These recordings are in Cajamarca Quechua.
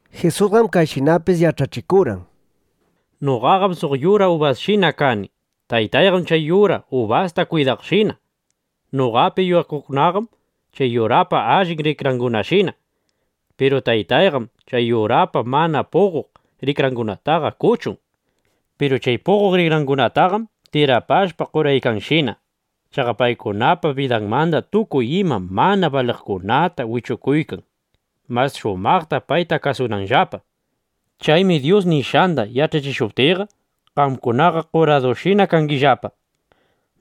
Jisusqam kayshinapis yach'achikurqan: —Noqaqam suq yura ubasshina kani. Taytayqam chay yura ubasta kwidaqshina. Noqapi yuyakuqkunaqam chay yurapa allin rikrangunashina. Piru Taytayqam chay yurapa mana puqoq rikrangunataqa kuchun. Piru chay puqoq rikrangunataqam tirapashpa qoraykanshina. Chaqa paykunapa bidanmanda tukuy ima mana baliqkunata wichukuykan, mas shumaqta payta kasunanllapa. Chaymi Dyus nishqanda yach'achishuptiyqa, qamkunaqa qoradushina kangillapa.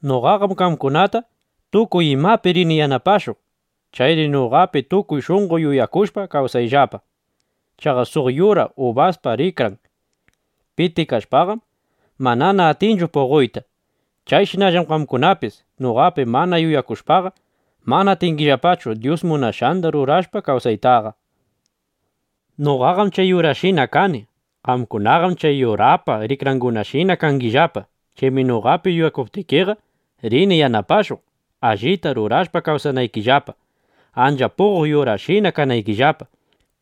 Noqaqam qamkunata tukuy imapi rini yanapashuq. Chayri noqapi tukuy shunqo yuyakushpa, kawsayllapa. Chaqa suq yura ubaspa rikran pitikashpaqam, manana atinchu puqoyta. Chayshinallam qamkunapis noqapi mana yuyakushpaqa, mana atingillapachu Dyus munashqanda rurashpa kawsaytaqa. ’Noqaqam chay yurashina kani. Qamkunaqam chay yurapa rikrangunashina kangillapa. Chaymi noqapi yuyakuptikiqa, rini yanapashuq, allita rurashpa kawsanaykillapa, ancha puqoq yurashina kanaykillapa.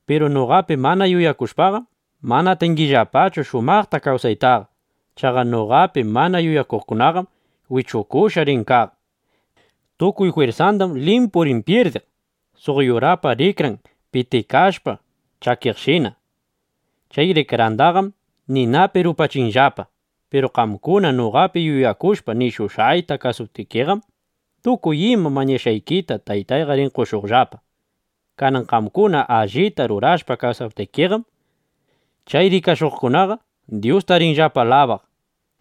Piru noqapi mana yuyakushpaqam, mana atingillapachu shumaqta kawsaytaqa. Chaqa noqapi mana yuyakuqqam wichukushqa rin kaq. Tukuy jwirsandam limpu rin pyirdiq, suq yurapa rikran pitikashpa chakiqshina. Chay rikrandaqam ninapi rupachinllapa. ’Piru qamkuna noqapi yuyakushpa, nishushqayta kasuwaptikiqam, tukuy ima mañashqaykita Taytayqa rin qoshuqllapa. Kanan qamkuna allita rurashpa kawsaptikiqam, chay rikashuqkunaqa Dyusta rinllapa alabaq.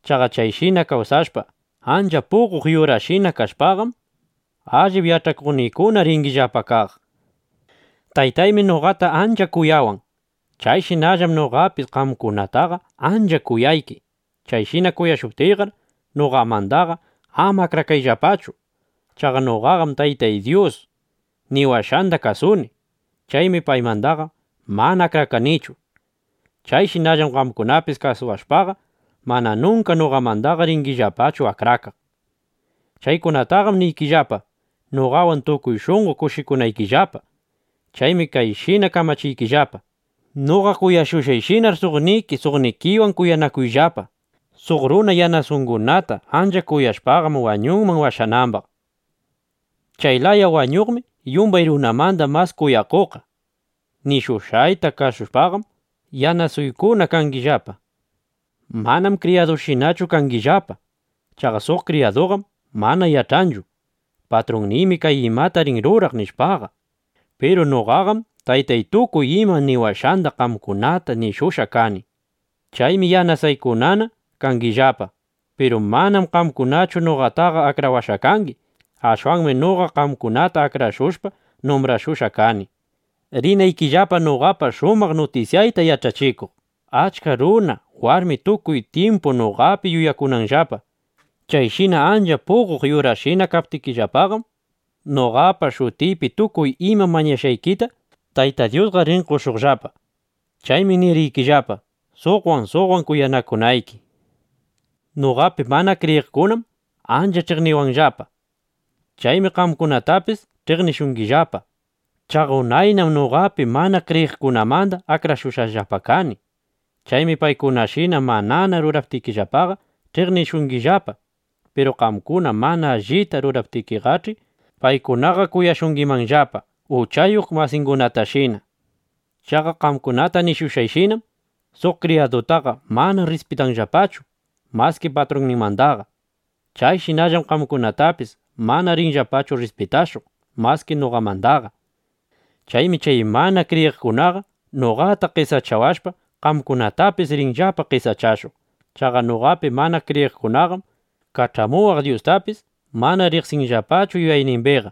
Chaqa chayshina kawsashpa, ancha puqoq yurashina kashpaqam, allip yach'akuqniykuna ringillapa kaq. Taytaymi noqata ancha kuyawan. Chayshinallam noqapis qamkunataqa ancha kuyayki. Chayshina kuyashuptiyqar, noqamandaqa ama akrakayllapachu. Chaqa noqaqam Taytay Dyus niwashqanda kasuni. Chaymi paymandaqa mana akrakanichu. Chayshinallam qamkunapis kasuwashpaqa, mana nunka noqamandaqa ringillapachu akrakaq. ’Chaykunataqam niykillapa, noqawan tukuy shunqo kushikunaykillapa. Chaymi kayshina kamachiykillapa: Noqa kuyashushqayshinar, suqniki suqnikiwan kuyanakuyllapa. Suq runa yanasungunata (yanasangunata) ancha kuyashpaqam, wañunman washanambaq. Chay laya wañuqmi yumbay runamanda mas kuyakuqqa. Nishushqayta kasushpaqam, yanasuykuna (yanasaykuna) kangillapa. Mananam kriyadushinachu kangillapa. Chaqa suq kriyaduqam mana yach'anchu: Patrunniymi kay imata rin ruraq, nishpaqa. Piru noqaqam Taytay tukuy ima niwashqanda qamkunata nishushqa kani. Chaymi yanasuykunana (yanasaykunana) kangillapa. Piru manam qamkunachu noqataqa akrawashqa kangi. Ashwanmi noqa qamkunata akrashushpa, numbrashushqa kani, rinaykillapa noqapa shumaq nutisyayta yach'achikuq, achka runa, warmi tukuy tyimpu noqapi yuyakunanllapa. Chayshina ancha puqoq yurashina kaptikillapaqam, noqapa shutiypi tukuy ima mañakushqaykita Tayta Dyusqa rin qoshuqllapa. Chaymi niriykillapa, suqwan suqwan kuyanakunayki. ’Noqapi mana kriyiqkunam ancha ch'iqniwanllapa. Chaymi qamkunatapis ch'iqnishungillapa. Chaqa unaynam noqapi mana kriyiqkunamanda akrashushqallapa kani. Chaymi paykunashina manana ruraptikillapaqa, ch'iqnishungillapa. Piru qamkuna mana allita ruraptikiqach'i, paykunaqa kuyashungimanllapa uchayuq masingunatashina. Chaqa qamkunata nishushqayshinam: “Suq kriyadutaqa mana rrispitanllapachu maski patrunninmandaqa.” Chayshinallam qamkunatapis mana rinllapachu rrispitashuq maski noqamandaqa. Chaymi chay mana kriyiqkunaqa noqata qesachawashpa, qamkunatapis rinllapa qesachashuq. Chaqa noqapi mana kriyiqkunaqam kach'amuwaq Dyustapis mana riqsinllapachu yuyaynimbiqa.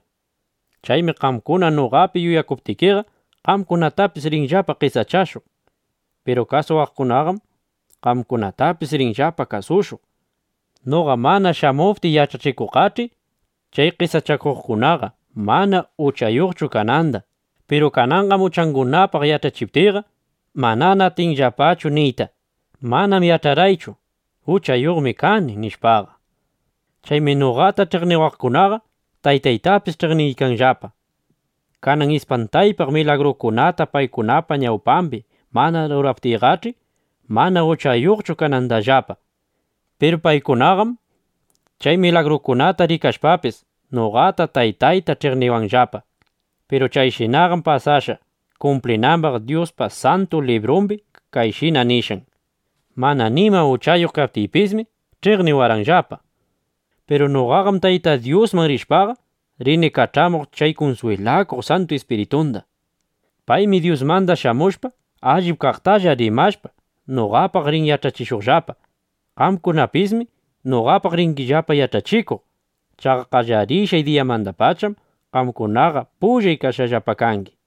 Chaymi qamkuna noqapi yuyakuptikiqa, qamkunatapis rinllapa qesachashuq. Piru kasuwaqkunaqam qamkunatapis rinllapa kasushuq. ’Noqa mana shamuptiy yach'achikuqqach'i, chay qesachakuqkunaqa mana uchayuqchu kananda. Piru kananqam uchangunapaq yach'achiptiyqa, manana atinllapachu niyta: “Manam yach'arqaychu: Uchayuqmi kani, nishpaqa”. Chaymi noqata ch'iqniwaqkunaqa Taytaytapis ch'iqniykanllapa. Kanan ispantaypaq milagrukunata paykunapa ñawpambi mana ruraptiyqach'i, mana uchayuqchu kanandallapa. Piru paykunaqam chay milagrukunata rikashpapis, noqata, Taytayta ch'iqniwanllapa. Piru chayshinaqam pasashqa, kumplinambaq Dyuspa Santu Librumbi kayshina nishqan: “Mana nima uchayuq kaptiypismi, ch'iqniwarqanllapa”, nishpa. ’Piru noqaqam Tayta Dyusman rishpaqa, rini kach'amuq chay kunswilakuq Santu Ispiritunda. Paymi Dyusmanda shamushpa, allip kaqtalla rimashpa, noqapaq rin yach'achishuqllapa. Qamkunapismi noqapaq ringillapa yach'achikuq. Chaqa qallarishqay diyamandapacham qamkunaqa pullay kashqallapa kangi.